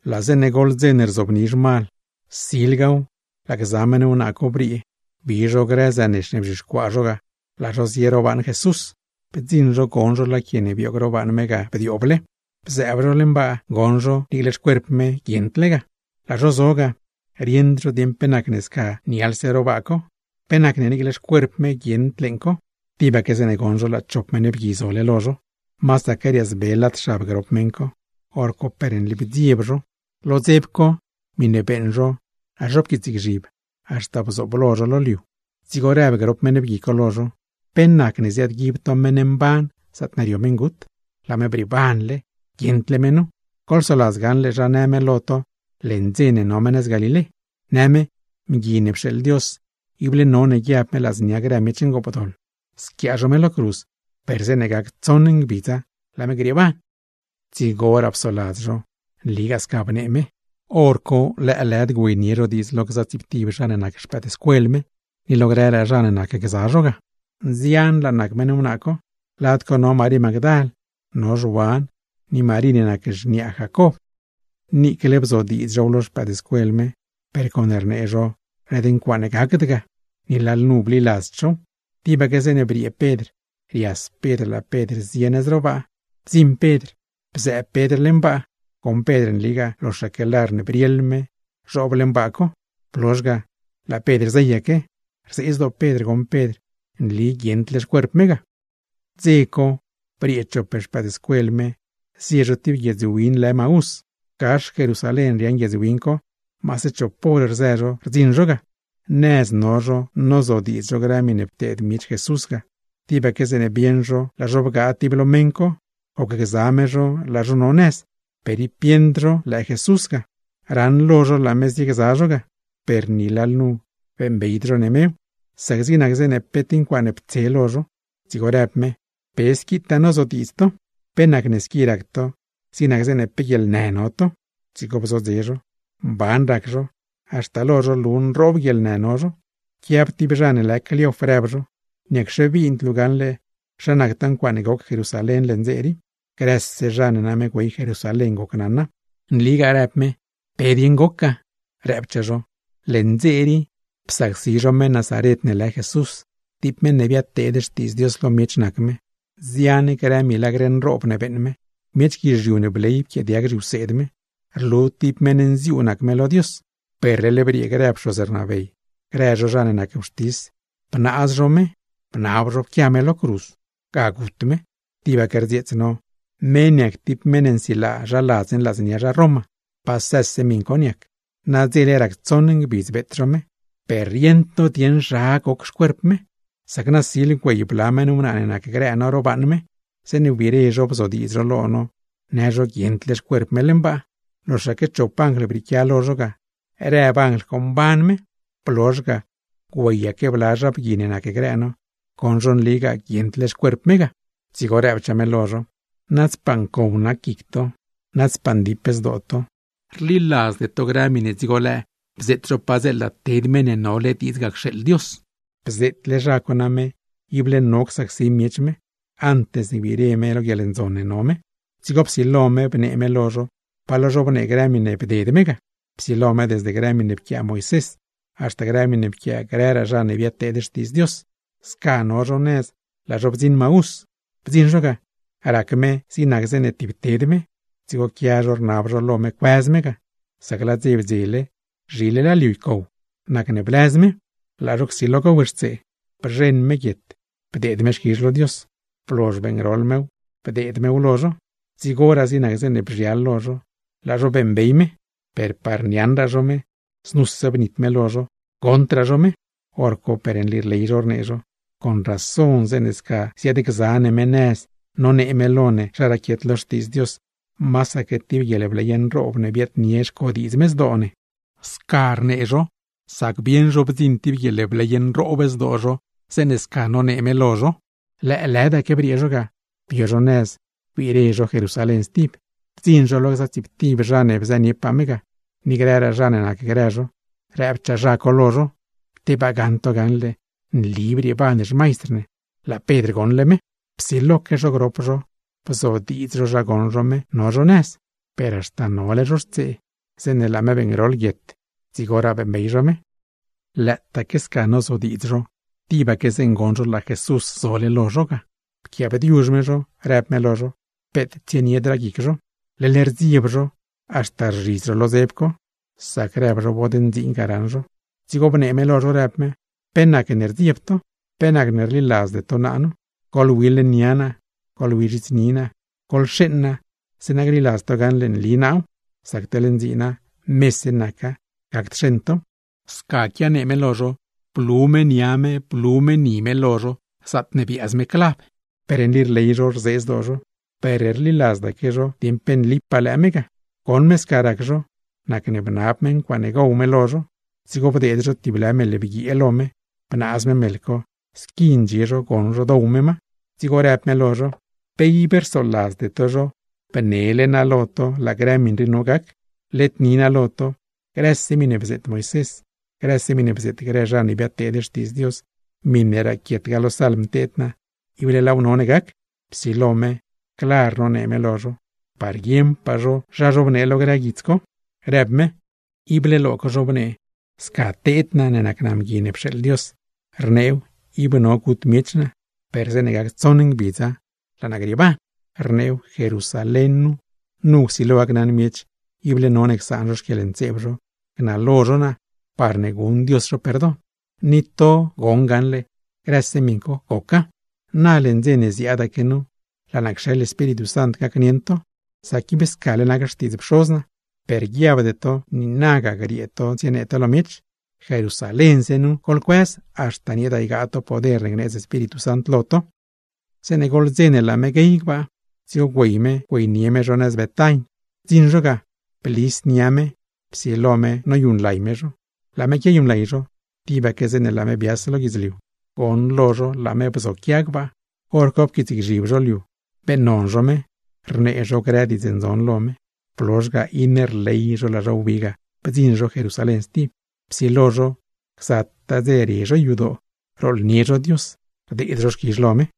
Laa zeeṉe goḻ dze ne rzobni zhmal, silgaw laa gza meṉ wnaa co briee, bi zho grë zënex ne bzhixcuaa zho ga, laa zho zie ro baaṉ Jesús. Bdziṉ zho, goṉ zho laa quie ne bioog ro baaṉ me ga bdiooble; bzëëb zho leṉ baa goṉ zho, niicle xcuerp me guieṉdle ga. Laa zho zo ga, rieṉd zho dieṉ pe nacne sca nialse ro baa co, pe nacne niicle xcuerp me guieṉd leeṉ co. Tibaque zeeṉe goṉ zho laa chop meṉ bgui zole lo zho ga, masaque riaazbel lad xab grop meṉ co. Horco per nli bdzieb zho, lo dzeb co miṉe beeṉ zho laa zho pquiitsgzhib haxta bdziṉ lo zho lo liu. Dzigo rëb grop meṉ bgui co lo zho: ―¿Pe nacne ziaadguib to meṉ mban zaatne rio meṉgut? ¡Laa me brieebanle! ¡Guieṉdle me nu! Goḻsoladz gaṉle zha në me lo to leṉ dze ne no me nëz Galilé, në me: “Mgui ne pxeeḻ Dios, ible none guiab me ladznia grë miech ngoopdoḻ, squiaa zho me lo cruz, per zeeṉe gac tsoṉ ngbidza, laa me grieeban.” Dzigoraa psoladz zho, nligaa sca bnee me, hor co lëëlëd güeynie zho diidz lo gza tsiiptib zha ne nac xpëëdscuel me, ni lo grëraa zha ne nacgza zho ga. Nzianlaa nac meṉ wnaa co, lad co no Marí Magdal, no Zhuan, ni Marí ne nac xniaa Jacob. Niicle bzodiidz zhow lo xpëëdscuel me, per con rnee zho led ncuaaṉ gacd ga, ni lalnu bliladzd zhow. Tibaque zeeṉe briee Pedr, rias Pedr laa Pedr zie nëz ro baa. Bdziṉ Pedr bdiixlo Pedr leṉ baa co, goṉ Pedr nligaa, ¡loxaque lar ne brieḻ me zhoob leeṉ co! Blozh ga, laa Pedr zeyaque, rzee zdoo Pedr goṉ Pedr nli guieṉdle xcuerp me ga. Dze co briee chop xpëëdscuel me zie zho tib guiedz win lë Maús. Gax Jerusalén riaaṉ guiedz win co, maase chop hor rzë zho rdziṉ zho ga. Nëz no zho nozodiidz zho grë miṉe pteed miech Jesús ga, tibaque zeeṉe bieṉ zho laa zho bgaa tib lo meṉ co, gocgza me zho laa zho no nëz, per, ¡ib bieṉd zho lëë Jesús ga! Raṉlo zho laa me ziegza zho ga, per ni lalnu beeṉbeyd zho ne mew, sac zig nac zeeṉ pe tib ncuaaṉe ptse lo zho. Dzigo rëb me: ―¿Pe squitaa nozodiidz to? ¿Pe nac squi rac to, zig nac zeeṉe pe guieḻnë no to? Dzigo bzodze zho. Mban rac zho, haxta lo zho rlu nroob guieḻnë no zho. Pquiab tib zha ne lë Cleof, rëb zho: ―¿Niacxe bind luu gaṉle zha nactaa ncuaaṉe goc Jerusalén leṉ dze rii? Grëse zha ne name güey Jerusalén, gocnaṉa. ―Nligaa ―rëb me―, ¿pe dieṉ goc ga? Rëbchaa zho: ―Leṉ dze rii psacsi zho meṉ Nazaret ne lë Jesús. Tib meṉ ne biadteed xtiidz Dios lo miech nac me, nzian grë milagr nroob ne beeṉ me; miech guizhiu ne bley pquiaadiag zhiwseed me. Rlu tib meṉ nziuu nac me lo Dios. Per leḻ briee grë pxoz rnabey, grë zho zha ne nac wxtis, bnaaz zho me, bnab zho gut me, pquiaa zho me lo cruz. Tibaque rdzieets no, me niac tib meṉ ne nsilaa zha ladz ne ladznia zha Roma. Pasëse miṉ co niac, nadzele rac tsoṉ ngbidz beet zho me. Per rieṉd no dieṉ zha nac cuent co, sac nasil güey bla meṉ wnaa ne nacgrë no ro baaṉ me, zeeṉe wbire zho bzodiidz zho lo no në zho guieṉdle xcuerp me leṉ baa, loxaque chop anjl brieequia lo zho ga, rëb anjl co mban me. Blozh ga, güeyaque bla zha bgui ne nacgrë no, goṉ zho nligaa guieṉdle xcuerp me ga. Dzigo rëbchaa me lo zho: ―¡Nadzpaa ncow nac guic to, nadzpaa ndip nac zdoo to! ¿Rliladzde to grë miṉe dzigo lëë bzeet zho padzeela ted Meṉ ne nole diidz ga cxeeḻ Dios? Bzeetle zha co name ible no csacsi miech me, antes ne gbire me lo guieḻndzon ne no me. Dzigo psilo me bnee me lo zho pa lo zhobnee grë miṉe bded me ga, psilo me desde grë miṉe pquiaa Moisés, haxta grë miṉe pquiaa grëraa zha ne biadteed xtiidz Dios. Sca no zho nëz laa zho bdziṉ Maús. Bdziṉ zho ga, rac me zig nac zeeṉe tib ted me, dzigo quia zho rnab zho lo me cuëz me ga, sac laa dze bdzele, zhile laa liu ycow. Nacne blëz me. Laa zho zob lo mezh gowxtsee zho, bzheṉ me guietxtil bdeed me xquizh lo Dios, blozh beeṉgroḻ mew bdeed mew lo zho. Dzigoraa zig nac zeeṉe bzhial lo zho, laa zho beeṉbey me. Per par niaṉraa zho me, znuse bnit me lo zho, goṉdraa zho me. Horco per nli rley zho rnee zho: ―Con razon zeeṉe sca ziaadgza ne me nëz nonee me lo ne zha raquiet lo Xtiidz Dios, masaque tib guieḻbley nroob ne biaadnie xcodiidz me zdoo ne. Sca rnee zho, sac bieṉ zho bdziṉ tib guieḻbley nroob zdoo zho, zeeṉe sca nonee me lo zho. Lëëlëdaque briee zho ga, bio zho nëz wbire zho Jerusalén stib. Bdziṉ zho lo gza tsiiptib zha ne bzëniepaa me ga, ni grëraa zha ne nacgrë zho, rëbchaa zha co lo zho: ―¡Tebaa gaṉ to gaṉle nli brieeban xmaistr ne! ¡Laa Pedr goṉle me! Psiloque zho grop zho bzodiidz zho zha goṉ zho me no zho nëz, per haxta horne no zho xtsee, zeeṉe laa me beeṉgroḻ guietxtil dzigoraa beeṉbey zho me. Lëëtaaque sca nozodiidz zho, tibaque zeeṉ goṉ zho laa Jesús zole lo zho ga, pquiaabdiuzh me zho, rëb me lo zho, peet tsieniedraa guic zho. Leḻ rdzieb zho, haxta rzhidz zho lo dzeb co, sac rëb zho bod ndziin ga raṉ zho. Dzigo bnee me lo zho rëb me: ―¿Pe nacne rdzieb to? ¿Pe nacne rliladzde to naa nu? Goḻwi leṉ nia naa, goḻwi zhits ni naa gaṉle. Goḻxeeṉ naa, zeeṉa gliladz to gaṉle nli naaw; sac teḻ ndziina, mese naca, gacd xeṉ tow. Sca quianee me, blu me nia me, blu me ni me lo zho, zaatne biaaz me clav. Per nli rley zho, rzee zdoo zho, per rliladzdaque zho dieṉ pe nlipaa lëë me ga. Goṉ me sca rac zho, nacne bnab me ncuaaṉe gow me lo zho. Dzigo bdeed zho tib lë meḻ bguiee lo me, bnaaz me meḻ co, squi ndxie zho goṉ zho dow me ma. Dzigo rëb me lo zho: ―¿Pe ib rsoladzde to nile naa laa grë miṉ rii no gac? Led ni naa lo to, grëse miṉe bzeet Moisés, grëse miṉe bzeet grë zha ne biadteed xtiidz Dios, miṉe raquietgaa lo Salm teed naa, ible laaw none gac. Psilo me clar nonee me lo zho, parne guieṉpaa zho zha zhobnee lo grë guits co, rëb me: ―Ible lo co zhobnee sca teed naa ne nac naa Mgui ne pxeeḻ Dios, rneew ib no gut miech naa, per zeeṉe gac tsoṉ ngbidza, laa naa grieeban. Rneew, Jerusalén nu, nu csilo gacnaṉ miech ible none csaan zho xquieḻntseeb zho, gnalo zho naa, parne guṉ Dios zho perdon. Ni to goṉ gaṉle grëse miṉ co, goca. Na leṉ dze ne ziaadaque nu, laa naa cxeḻ Espíritu Sant gacnieṉ to, sac ib scale nac xtiidz Pxoz naa. Per guiabde to niinaga griee to tsienee to lo miech, Jerusalénse nu goḻcuëz, haxta nieeda ygaa to poder ne gneedz Espíritu Sant lo to. Zeeṉe goḻ dze ne laa me guey gbaa, dzigo güey me güeynie me zho nëz Betain. Bdziṉ zho ga, blis me nia me, psilo me noyuṉlay me zho. Laa me quiayuṉlay zho, tibaque zeeṉe laa me bias lo guidzliu, ¡goṉlo zho laa me bzoquia gbaa! Horco pquiitsgzhib zho liu, beeṉnon zho me, rnee zho grë diidz ndzon lo me; blozh ga iṉe rley zho laa zho wbi ga, bdziṉ zho Jerusalén stib. Psilo zho gzataa dze rie zho yadoo rooḻnie zho Dios, rdeed zho xquizh lo me.